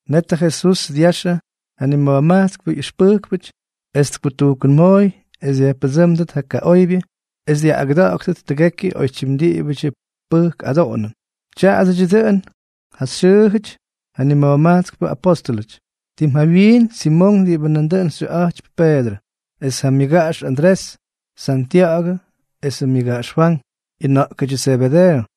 Net ja Jesús dyaxʉ ja nima̱jmajtskpʉ ꞌyʉxpʉjkpʉty, es tkutujkʉnmooy es dyajpʉdsʉ́mdʉt ja kaꞌoybyʉ es dyaꞌꞌagʉda̱ꞌa̱ktʉt tʉgekyʉ oytyim diꞌibʉdyʉ pʉjk adoꞌonʉn. Tya̱a̱dʉdyʉ dʉꞌʉn ja xyʉʉjʉty ja nima̱jmajtskpʉ apóstʉlʉty: Tim jawyiin Simonk diꞌibʉ nandʉꞌʉn xyʉꞌa̱jtypy Peedrʉ, es ja myʉgaꞌax Andrés; Santya̱ꞌa̱gʉ esʉ myʉgaꞌax Fwank, ꞌyʉna̱ꞌkʉdyʉ Zebedeeʉ;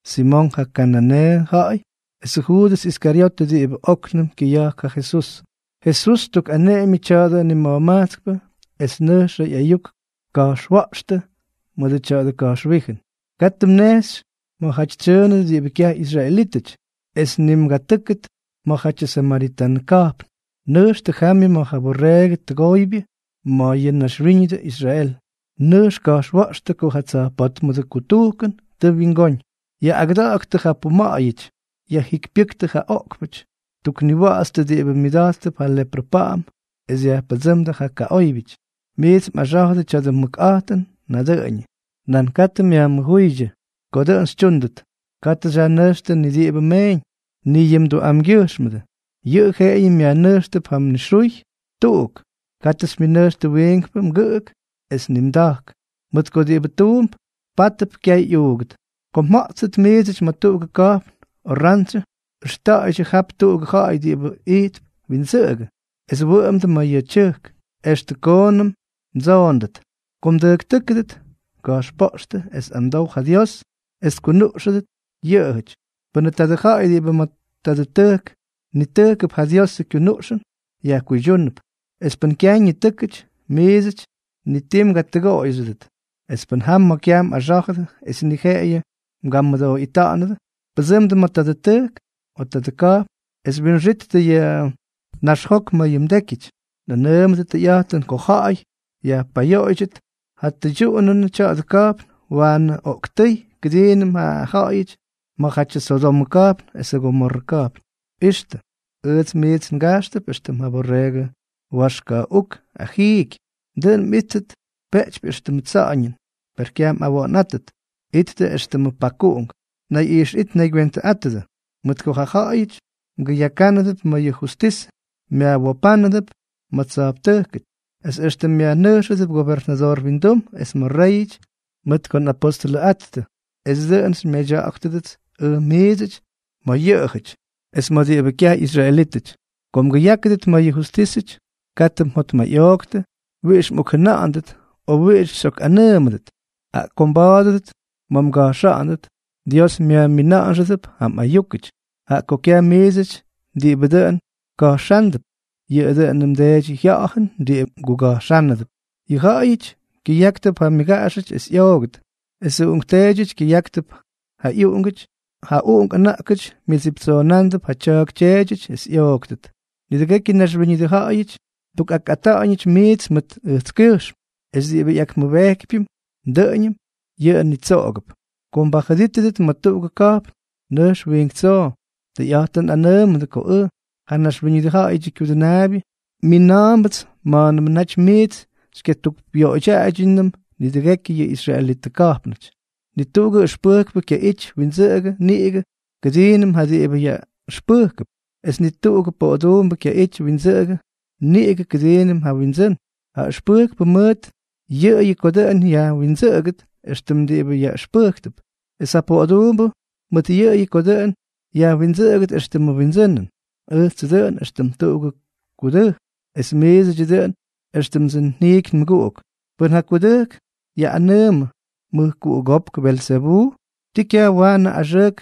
Simonk ja kananeeʉ ja̱ꞌa̱y; esʉ Juudʉs Iskaryotʉ diꞌibʉ óknʉm kyʉya̱jk ja Jesús. Jesús ttukꞌaneꞌemyʉ tya̱dʉ nima̱jmajtskpʉ es nʉjx ꞌyayuk ka̱jxwa̱ꞌxtʉ mʉdʉ tya̱dʉ ka̱jxwíjʉn: —Katʉ mnejxy ma̱jaty tsyʉʉnʉdʉ diꞌibʉ kyaj ꞌyisraelítʉty, es ni mgatʉ́kʉt ma̱jatyʉ samaritanʉ ka̱jpn. Nʉjxtʉ jamyʉ ma̱ ja borreegʉ tʉgoybyʉ ma̱ yʉ ñaxwíñʉdʉ Israel. Nʉjx ka̱jxwa̱ꞌxtʉ ko ja tsa̱jpótmʉdʉ kutujkʉn tʉ wyingóñ. Yaꞌꞌagʉda̱ꞌa̱ktʉ ja puma̱ꞌa̱yʉty, yajjikypyʉ́ktʉ ja oꞌkpʉty, tukniwa̱ꞌa̱tstʉ diꞌibʉ myʉda̱jttʉp ja leprʉ pa̱ꞌa̱m, es yajpʉdsʉ́mdʉ ja kaꞌóybyʉty. Miits mꞌaxá̱jʉdʉ tya̱dʉ mʉkꞌa̱jtʉn nadʉꞌʉñʉ, nan katʉ myajmʉjúydyʉ ko dʉꞌʉn xytyúndʉt. Katʉ xyajnʉjxtʉ ni diꞌibʉ meeñ, ni yʉ mduꞌamgyʉjxmʉdʉ. Yʉꞌʉ jeꞌeyʉ myajnʉjxtʉp ja mnixuy tuꞌuk. Katʉ xymyʉnʉjxtʉ wiinkpʉ mgʉꞌʉk es ni mda̱jk, mʉt ko diꞌibʉ tuump, pátʉp kyaꞌay ꞌyuugʉt. ’Ko mja̱ꞌttʉt miidsʉty ma̱ tuꞌugʉ ka̱jpn o rantsyʉ, ʉxta̱ꞌa̱ydyʉ jap tuꞌugʉ ja̱ꞌa̱y diꞌibʉ ijtp windsʉꞌʉgʉ, es wʉꞌʉmdʉ ma̱ yʉꞌʉ tyʉjk extʉ koonʉm mdsoona̱ꞌa̱ndʉt. Ko mdʉjktʉ́kʉdʉt, ka̱jxpoꞌxtʉ es amdow ja Dios es kyunuꞌxʉdʉt yʉꞌʉjʉty. Pʉnʉ tadʉ ja̱ꞌa̱y diꞌibʉ ma̱ tadʉ tʉjk nitʉjkʉp ja Diosʉ kyunuꞌxʉn, yajkuydyúnʉp; es pʉn kyaj ñitʉ́kʉty, miidsʉty ni tii mgatʉgoꞌoyxʉdʉt. Es pʉn jam ma̱ kyaj mꞌaxá̱jʉdʉ es ni jeꞌeyʉ mgamʉdooꞌita̱ꞌa̱nʉdʉ, pʉdsʉmdʉ ma̱ tadʉ tʉjk o tadʉ ka̱jpn es winxittʉ yʉ naxjok ma̱ yʉ mdékyʉty. Nꞌanʉʉmʉdʉ tʉyꞌa̱jtʉn ko ja̱ꞌa̱y yajpayoꞌoydyʉt, ja tyʉydyuꞌunʉnʉ tya̱dʉ ka̱jpn waanʉ oꞌktʉ́y kʉdiinʉm ja ja̱ꞌa̱yʉty ma̱jatyʉ Sodomʉ ka̱jpn esʉ Gomorrʉ ka̱jpn. ’¡Ixtʉ! Ʉjts miits ngajxtʉp éxtʉm ja borreegʉ waxka̱ꞌuk agijky. Dʉꞌʉn mꞌíttʉt peꞌtypy éxtʉmʉ tsa̱ꞌa̱ñʉn, per kyaj mꞌawa̱ꞌa̱nꞌáttʉt. Ittʉ éxtʉmʉ pakuꞌunk. Nayꞌixꞌit naygywentʉꞌátʉdʉ, mʉt ko ja̱ꞌa̱yʉty mgʉyakánʉdʉp ma̱ yʉ justisʉ, myajwopánʉdʉp ma̱ tsa̱jptʉjkʉty, es extʉ myajnʉjxʉdʉp gobernadoor windum es ma̱ réyʉty mʉt ko nꞌapostʉlʉꞌattʉ, es dʉꞌʉn xymyadya̱ꞌa̱ktʉdʉts ʉj miidsʉty ma̱ yʉꞌʉjʉty es ma̱ diꞌibʉ kyaj ꞌyisraelítʉty. Ko mgʉyákʉdʉt ma̱ yʉ justísʉty, katʉ mjotmayꞌooktʉ wiꞌix mꞌokjʉna̱ꞌa̱ndʉt o wiꞌix xyꞌokꞌanʉʉmʉdʉt, jaꞌa ko mba̱a̱dʉdʉt ma̱ mga̱jxa̱ꞌa̱ndʉt, Dios myajmiꞌinxʉdʉp ja mꞌayúkʉty, jaꞌa ko kyaj miidsʉty diꞌibʉ dʉn ka̱jxándʉp, yʉꞌʉ dʉꞌʉnʉ mDeedyʉ Jya̱ꞌa̱jʉn diꞌibʉ mguga̱jxánʉdʉp. ’Yʉ ja̱ꞌa̱yʉty kyʉyáktʉp ja myʉgaꞌaxʉty es ꞌyoogʉt, esʉ uꞌunkteedyʉty kyʉyáktʉp ja ꞌyuꞌungʉty; ja uꞌunk ʉna̱ꞌkʉty myʉdsiptsoondʉp ja tya̱a̱k tyeedyʉty es ꞌyooktʉt. Nidʉgekyʉ naxwíñʉdʉ ja̱ꞌa̱yʉty mdukꞌakꞌata̱ꞌa̱ñʉty miits mʉt ʉjtskyʉjxm. Es diꞌibʉ ꞌyakmʉbejkypyʉm dʉꞌʉñʉm, yʉꞌʉ nitsoꞌogʉp. Ko mbajʉdítʉdʉt ma̱ tuꞌugʉ ka̱jpn, nʉjx wiink tsoo. Tʉyꞌa̱jtʉn nꞌanʉʉmʉdʉ ko ʉj, ja Naxwíñʉdʉ Ja̱ꞌa̱yʉdyʉ Kyudʉnaabyʉ, mina̱a̱mbʉts ma̱a̱nʉmʉ naty miits xykyatukꞌyoꞌoydyaꞌaydyʉnʉm nidʉgekyʉ yʉ israelitʉ ka̱jpnʉty. ’Ni tuꞌugʉ ʉxpʉjkpʉ kyaꞌity windsʉꞌʉgʉ niꞌigʉ kʉdiinʉm ja diꞌibʉ yaꞌʉxpʉjkʉp, es ni tuꞌugʉ poꞌoduumbʉ kyaꞌity windsʉꞌʉgʉ niꞌigʉ kʉdiinʉm ja wyindsʉ́n. Ja ʉxpʉjkpʉ mʉt yʉꞌʉyʉ ko dʉꞌʉn yajwindsʉꞌʉgʉt éxtʉm diꞌibʉ yaꞌʉxpʉjkʉp, es ja poꞌoduumbʉ mʉt yʉꞌʉyʉ ko dʉꞌʉn yajwindsʉꞌʉgʉt éxtʉmʉ wyindsʉnʉn. Ʉjtsʉ dʉꞌʉn éxtʉm tuꞌugʉ kudʉjk, es miidsʉty, dʉꞌʉn éxtʉmdsʉ njiiky nmʉguꞌuk. Pʉn ja kudʉjk yaꞌꞌanʉʉmʉ mʉjkuꞌugópk Belzebuu, ¿tii kyaj waanʉ axʉʉk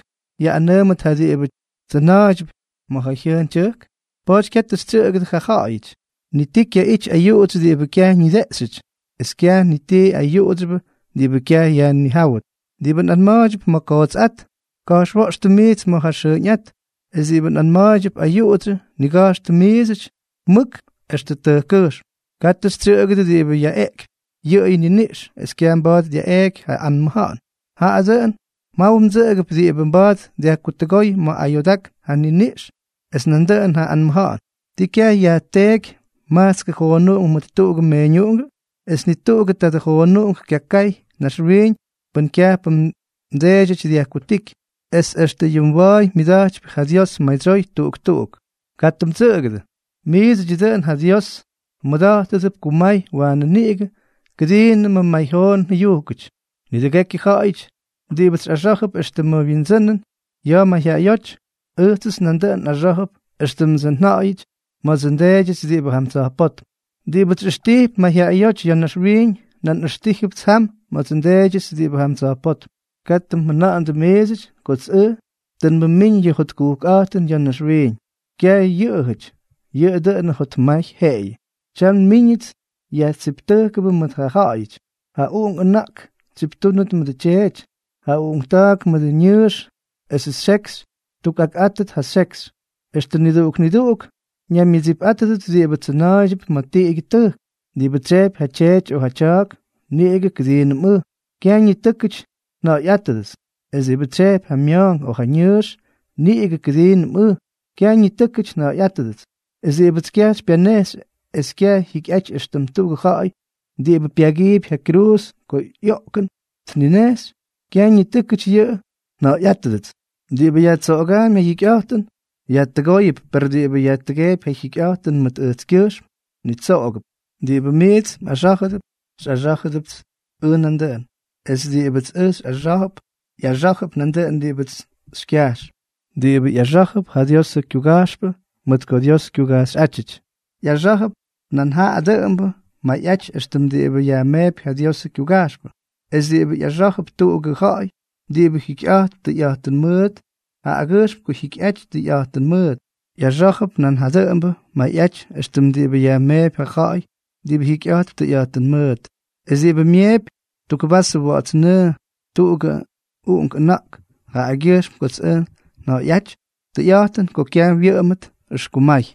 yaꞌꞌanʉʉmʉdʉt ja diꞌibʉ tsyʉna̱a̱ydyʉp ma̱ ja jyʉʉn tyʉjk? ’Pa̱a̱ty katʉ xytsyʉꞌʉgʉdʉ ja̱ꞌa̱yʉty. Ni ti kyaꞌity ayuꞌudsyʉ diꞌibʉ kyaj ñideꞌxyʉty, es kyaj ni ti ayuꞌudsyʉbʉ diꞌibʉ kyaj yajnijáwʉt. Diꞌibʉ nꞌanma̱a̱ydyʉp ma̱ ja kootsꞌát, ka̱jxwa̱ꞌxtʉ miits ma̱ ja xʉʉñꞌát; es diꞌibʉ nꞌanma̱a̱ydyʉp ayuꞌudsyʉ, niga̱jxtʉ miidsʉty mʉk extʉ tʉjkkʉjxm. Katʉ xytsyʉꞌʉgʉdʉ diꞌibʉ yaꞌeꞌkypy yʉꞌʉyʉ niniꞌx es kyaj mba̱a̱t dyaꞌeeky ja anmʉja̱ꞌa̱n; jaꞌa dʉꞌʉn mjaw mdsʉꞌʉgʉp diꞌibʉ mba̱a̱t dyajkutʉgóy ma̱ ayoodákn ja niniꞌx es nandʉꞌʉn ja anmʉja̱ꞌa̱n. ’¿Tii kyaj yajteeky majtskʉ joonuꞌunk mʉt tuꞌugʉ meeñuꞌungʉ? Es ni tuꞌugʉ tadʉ joonuꞌunk kyaka̱ꞌa̱y naxwiiñ pʉn kyajpʉ mDeedyʉty dyajkutíky. Es extʉ yʉ mwa̱a̱y myʉda̱jtypy ja Dios madsyoy tuꞌuk tuꞌuk. Katʉ mdsʉꞌʉgʉdʉ. Miidsʉdyʉ dʉꞌʉn ja Dios mmʉda̱jtʉdʉp kumay waanʉ niꞌigʉ kʉdiinʉm may ja joonuꞌungʉty. ’Nidʉgekyʉ ja̱ꞌa̱yʉty diꞌibʉts xyꞌaxá̱jʉp éxtʉmʉ wyindsʉnʉn ya̱ mayjyaꞌayóty, ʉjtsʉts nandʉꞌʉn nꞌaxá̱jʉp éxtʉmdsʉ nja̱ꞌa̱yʉty ma̱dsʉ nDeedyʉts diꞌibʉ jam tsa̱jpótm. Diꞌibʉts xyꞌʉxtijp mayjyaꞌayóty ya̱ naxwiiñ, nan nꞌʉxtíjʉpts ʉj ma̱dsʉ nDeedyʉts diꞌibʉ jam tsa̱jpótm. ’Katʉ mjʉna̱ꞌa̱ndʉ miidsʉty kots ʉj tʉ nmʉmíñ yʉ jotkujkꞌa̱jtʉn ya̱ naxwiiñ. Kyaj yʉꞌʉjʉty; yʉꞌʉ dʉꞌʉnʉ jotmay jeꞌeyʉ. Tyam tʉ nmíñʉts yajtsiptʉjkʉbʉ mʉt ja ja̱ꞌa̱yʉty. Ja uꞌunk ʉna̱ꞌk tsyiptúnʉt mʉdʉ tyeety, ja uꞌunkta̱a̱k mʉdʉ ñʉʉx esʉ xekxy ttukꞌakꞌátʉt ja xyekx. Extʉ niduꞌuk niduꞌuk ñaymyʉdsipꞌátʉdʉt diꞌibʉ tsʉna̱a̱ydyʉp ma̱ tiꞌigyʉ tʉjk. ’Diꞌibʉ tsyejpy ja tyeety o ja tya̱a̱k niꞌigʉ kʉdiinʉm ʉj, kyaj ñitʉ́kʉty nja̱ꞌa̱yꞌátʉdʉts; es diꞌibʉ tsyejpy ja mya̱a̱nk o ja ñʉʉx niꞌigʉ kʉdiinʉm ʉj, kyaj ñitʉ́kʉty nja̱ꞌa̱yꞌátʉdʉts; es diꞌibʉts kyaj xypyanejxy es kyaj jyikyꞌaty éxtʉm tuꞌugʉ ja̱ꞌa̱y diꞌibʉ pyagiipy ja kyruuz ko ꞌyoꞌkʉn tninejxy, kyaj ñitʉ́kʉty yʉꞌʉ nja̱ꞌa̱yꞌátʉdʉts. Diꞌibʉ yajtsoꞌogaampy ja jyikyꞌa̱jtʉn, yajtʉgóyʉp; per diꞌibʉ yajtʉgeepy ja jyikyꞌa̱jtʉn mʉt ʉjtskyʉjxm, nitsoꞌogʉp. ’Diꞌibʉ miits mꞌaxá̱jʉdʉp, xyꞌaxá̱jʉpts ʉj nandʉꞌʉn; es diꞌibʉts ʉj xyꞌaxá̱jʉp, ꞌyaxá̱jʉp nandʉꞌʉn diꞌibʉts xykyajx. Diꞌibʉ ꞌyaxá̱jʉp ja Diosʉ kyuga̱jxpʉ mʉt ko Dios kyugajxyꞌátyʉty, ꞌyaxá̱jʉp nan ja dʉꞌʉmbʉ mayꞌaty éxtʉm diꞌibʉ yajmeepy ja Diosʉ kyuga̱jxpʉ; es diꞌibʉ ꞌyaxá̱jʉp tuꞌugʉ ja̱ꞌa̱y diꞌibʉ jikyꞌa̱jtp tʉyꞌa̱jtʉn mʉʉt jaꞌagyʉjxm ko jyikyꞌajty tʉyꞌa̱jtʉn mʉʉt, ꞌyaxá̱jʉp nan ja dʉꞌʉmbʉ mayꞌaty éxtʉm diꞌibʉ yajmeepy ja ja̱ꞌa̱y diꞌibʉ jikyꞌa̱jtp tʉyꞌa̱jtʉn mʉʉt. Es diꞌibʉ myeepy tuk vasʉ wa̱ꞌa̱ts nʉʉ tuꞌugʉ uꞌunk ʉna̱ꞌk jaꞌagyʉjxm kots ʉj nja̱ꞌa̱yꞌáty, tʉyꞌa̱jtʉn ko kyaj wyʉꞌʉmʉt ʉxkumay.